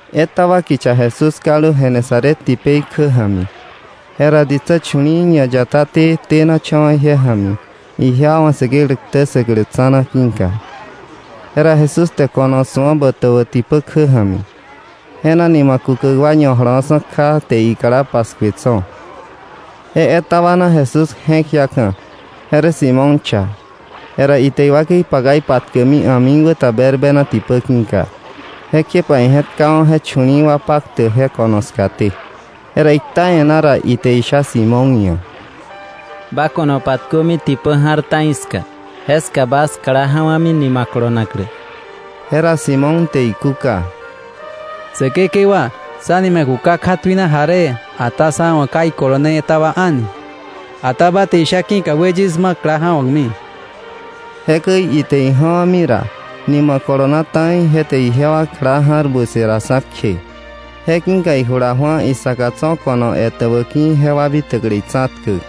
Etaba kicha Jesús kaldu Genesaret tipei kjä ja̱mi. Jera ditsä chu̱li̱i̱ ñayataté tenacha̱wa̱ ije ja̱mi, ijewa wa̱ Säkeklä ktä ssäklä tsa̱na ki̱ka. Jera Jesús te ko̱no su̱a botäbä tipä kjä ja̱mi; je na nima kukäk wa ñajolowa̱ksa̱ kja, te ikla paskue tso̱. Je etaba na Jesús je̱k jiaka̱; je rä Simón cha. Jera ite iwakei paka ipatkäkmi a̱mikwäta berbena tipä ki̱ka. Jekjepa ije̱tkawa̱ je chu̱li̱i̱ wa paktäk je ko̱no skaté. Jera ikta e̱ná ra, ite isha Simón ia̱: —Ba ko̱no patkömi tipä ja̱r ta̱i ska, jeska bas kla ja̱wa̱mi nima kolonaklä. Jera Simón te ikúka: —Säkekewa, sá nima kuka kja tuina jaree, ata sá wa̱ ka ikolone etaba a̱ni; ata ba te isha ki̱ka we yis ma kla ja̱wa̱kmi. Jekäi ite ija̱wa̱mi ra, nima kolona ta̱i, je te ijewa kla ja̱r butse raksa̱ kje. Je ki̱ka ijula ju̱a isaka tso̱ ko̱no etäbä ki̱ jewa bitäklä itsa̱tkäk.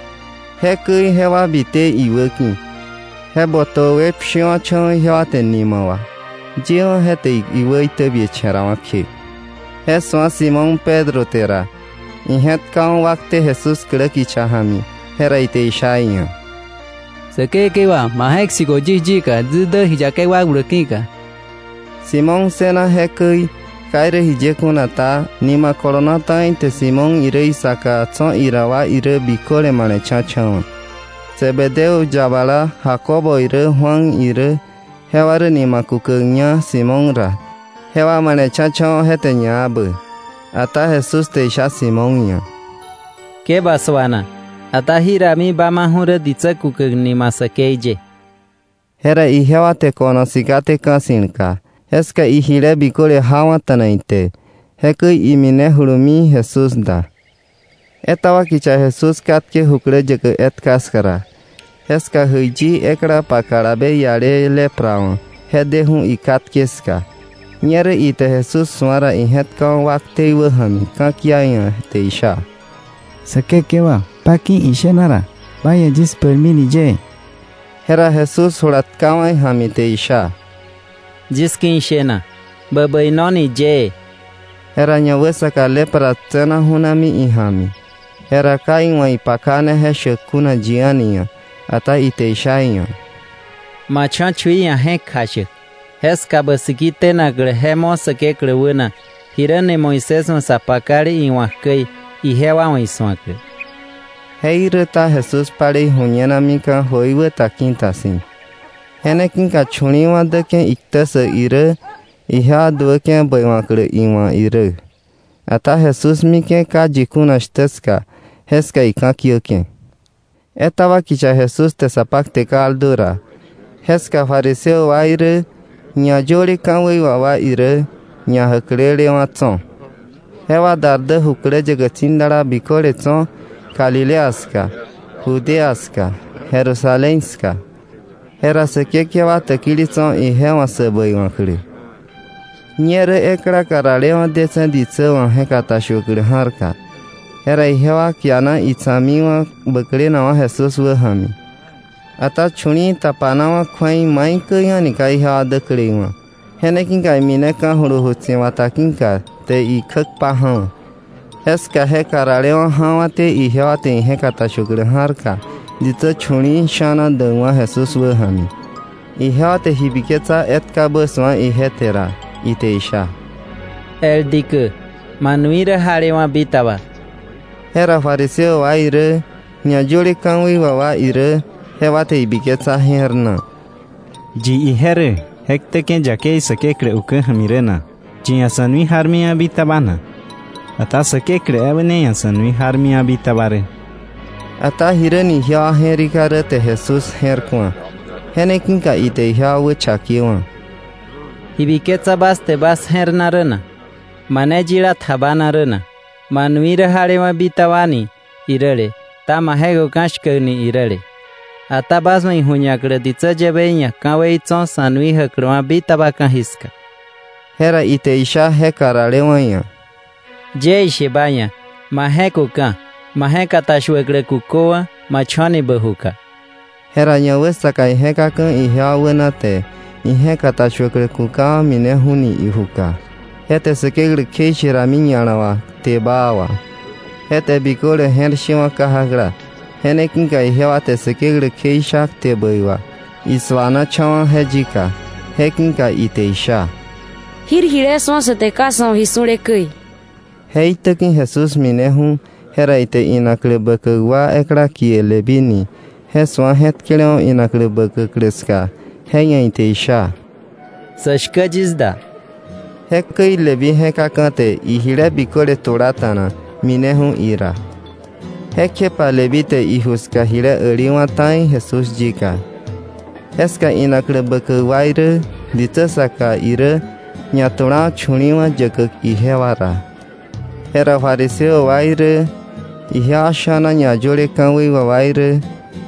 Jekäi jewa bite iwäki̱, je botäbä we pshiwa̱cha̱wa̱ ijewa te nima wà, yewa̱ je te iwä itäbiecha̱rawa̱ kje. Je su̱a Simón Pedro te ra, ije̱tkawa̱ wakte Jesús klä kicha ja̱mi, jera ite isha iia̱: —¡Säkekewa, ma je̱k sikö yis yika, yis dä ji yakei wakbläk ki̱ka! Simón ssëna jekäi, ka jiye kuna ta, nima kolona ta̱i te Simón irä isaka tso̱ ira wa biköle male̱cha̱cha̱wa̱. Zebedeo yabala Jacobo irä Juan irä, jewa rä nima kukäkña Simón ra, jewa male̱cha̱cha̱wa̱ je te ñakäi. Ata Jesús te isha Simón ia̱: —Ke ba suana. Ata jirami ba maju̱ rä ditsä kukäk nima säkei ye. Jera ijewa te ko̱no sikaté ka̱ ssi̱lka. Jeska ijile biköle jawa̱ta̱na ite, jekäi iminejulumi Jesús da. Etaba kicha Jesús katke jukläyäkä etka ska ra, jeska jäiyi ekla pa kalabe iale lepra wa̱ je deju̱ ikatke ska. Ñerä ite Jesús su̱a ra, ije̱tkawa̱ wakte iwäja̱mi, ka̱kia iia̱ te isha: —Säkekewa, ba ki̱ ishena ra, ba ia̱ yis bäirmini yëë. Jera Jesús jula tkawa̱ ija̱mi te isha: —Yis ki̱ ishena; bä bäinoni yëë. Jera ñawäsaka lepra tse̱naju̱mi ija̱mi. Jera ka iwa̱ ipakane je shäk kuna yi a̱ni ia̱, ata ite isha iia̱: —Ma cho̱ chui ia̱ je̱k kjashäk. Jeska bä siki tenaklä je mo̱ Säkeklä wäna, jiräni Moisés wa̱ sa pakale iwa̱k käi, ijewa wa̱ isu̱aklä. Jeiräta Jesús palei ju̱ñenamika̱ jöikwä ta ki̱ta si̱. Je ne ki̱ka chu̱li̱i̱wa̱ däke̱ iktä ssäk irä, ijewa duäke̱ bäiwa̱klä iwa̱ irä. Ata Jesús mike̱ ka yi kuna shtä ska, jeska ika̱kiäke̱. Etaba kicha Jesús te sa pakte kaldu ra, jeska fariseo wa irä ñayöle ka̱wei wà wa irä ñajäklelewa̱ tso̱. Jewa dar jukläyäkä tsi̱dala biköle tso̱ Galilea ska, Judea ska, Jerusalén ska. Jera Säkekewa täkili tso̱ ije wa̱ sä bäiwa̱klä. Ñerä ekla karalewa̱ detse̱ ditsä wa̱ je̱k katashuäklä ja̱rka. Jera ijewa kiana itsa̱kmiwa̱ bäklenakwa̱ Jesús wäja̱mi. Ata chu̱li̱i̱ tapanawa̱ kju̱ei maikäi a̱ni ka ijewa däkleiwa̱. Je ne ki̱ka imineka̱ju̱lu ju tsi̱bata ki̱ka te ikjä kpaja̱wa̱. Jeska je karalewa̱ ja̱wa̱té ijewa te ije̱k katashuäklä ja̱rka ditsä chu̱li̱i̱ sha̱na däkwa̱ Jesús wäja̱mi. Ijewa te ji biketsa etkabä su̱a ije te ra, ite isha: —El dikä, ma nui rä jalewa̱ bitaba. Jera fariseo wa irä ñayöle ka̱wei wà wa irä, jewa te ibiketsa je̱r na: “¿Yi ije rä, je ktäke̱ yakei Säkeklä ukä ja̱mi rä na? ¿Yi ia̱ sa̱ nui jarmiwa̱ bitaba na? Ata Säkeklä ebä ne ia̱ sa̱ nui jarwa̱ bitaba rä.” Ata jiräni ijewa je̱rika rä te Jesús je̱r ku̱a. Je ne ki̱ka ite ijewa wächakewa̱: —¿Ji biketsa bas te bas je̱r na rä na? ¿Mane yila tjabana rä na: ‘Ma nui rä jalewa̱ bitaba’ ni iräle, ta ‘ma je̱köka̱ shkäk’ ni iräle? Ata bas wa̱ iju̱ñaklä ditsä yäbei ia̱ ka̱wei tso̱ sa̱ nui jäkläwa̱ bitaba ka̱jiska—jera ite isha je karalewa̱ ia̱—: —Yie ishe ba ia̱, ma je̱köka̱, ma je̱katashuäklä kuköwa̱, ma cho̱ni bä juka. Jera ñawäsaka ije̱kaka̱ ijewa wäna, te ije̱katashuäklä kukawa̱, mineju̱ni ijuka. Je te Säkeklä kjeishe rami ña̱la wà kte baa wà. Je te biköle je̱r shewa̱ kajakla. Je ne ki̱ka ijewa te Säkeklä kjeisha kte bäi wà. Isuanacha̱wa̱ je yika, je ki̱ka ite isha: —Jir jile su̱a sä te, ka sa̱ wa̱ ji su̱le käi. Je itäki̱ Jesús mineju̱, jera ite inaklä bäkäk wa ekla kie Leví ni je su̱a je̱tkelewa̱ inaklä bäkäklä ska, je ia̱ ite isha: —Sä shkä yis da. Jekäi Leví je̱kaka̱ te ijile biköle tulata̱na, mineju̱ ira. Jekjepa Leví te iju ska jile äliwa̱ ta̱i Jesús yika. Jeska inaklä bäkäk wa irä, ditsä saka irä jewa chu̱li̱i̱wa̱ ñatulawa̱ yäkäk ijewa ra. Jera fariseo wa irä, ijewa sha̱na ñayöle ka̱wei wà wa irä,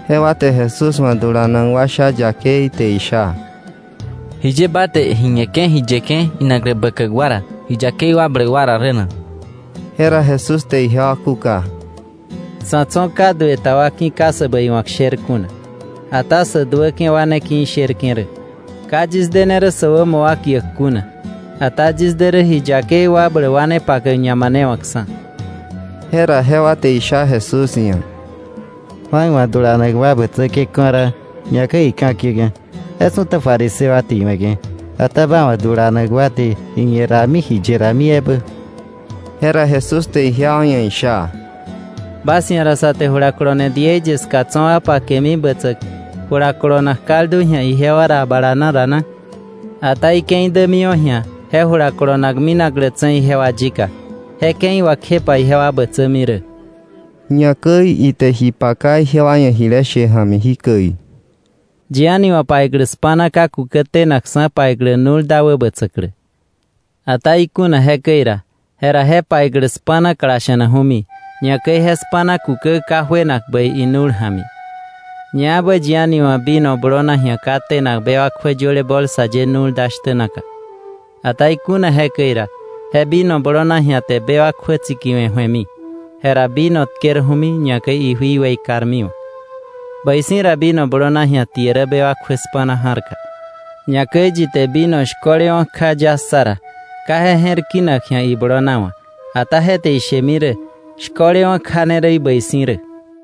jewa te Jesús wa̱ dulanak wa sha yakei te isha: —¿Jiye ba te ji ñeke̱ ji yeke̱ inaklä bäkäk wa ra ji yakei wakbläk wa ra rä na? Jera Jesús te ijewa kúka: —Sa̱ tso̱ ka duë ta wa ki̱ ka sä bäiwa̱k sher kuna, ata sä duäke̱ wa ne ki̱ isherke̱ rä. Ka yis dene rä sä wämo wa kiäk kuna, ata yis de rä ji yakei wakbläk wa ne pakäk ñamanewakksa̱. Jera jewa te isha Jesús ia̱: —Juan wa̱ dulanak wa bätsäke̱ ka̱raa, ñakäi ika̱kiäke̱. Je su̱ta fariseo wa te iwe̱ke̱. Ata ba wa̱ dulanak wa te ji ñe rami ji ye rami ebä. Jera Jesús te ijewa ia̱ isha: —¿Bas ia̱ ra sä te julakolone diei ye ska tso̱ wa pakemi bätsäk jula kolonak kaldu ji̱a ijewa ra bala na ra na? Ata ike̱i dämiwa̱ ji̱a je jula kolonak minaklätse̱ ijewa yika, je ke̱i wà kjepa ijewa bätsämi rä. Ñakäi ite ji paka ijewa ia̱ jile she ja̱mi jikäi: —Yi a̱ni wa̱ paiklä spa̱na ka kukä tenakksa̱ paiklä nu̱l da wäbätsäklä. Ata ikuna jekäi ra, jera je paiklä spa̱na klasha̱naju̱mi, ñakäi je spa̱na kukä ka juenak bäi inu̱l ja̱mi. Ñaebä yi a̱ni wa̱ vino blona ji̱a ka tenak bewak kjuä yöle bolsa ye nu̱l da shtä naka. Ata ikuna jekäi ra, je vino blona ji̱a te bewak kjuä tsikiwe̱ ju̱emi, jera vino tkerju̱mi, ñakäi ijui weikarmiwa̱. Bäi si̱ ra vino blona ji̱a tie rä bewak kjuä spa̱na ja̱rka. Ñakäi yi te vino shko̱lewa̱ kja ya ssa ra, ka je je̱r ki̱nak ji̱a iblona wa̱, ata je te ishemi rä: ‘Shkolewa̱ kja ne rä bäi si̱ rä.’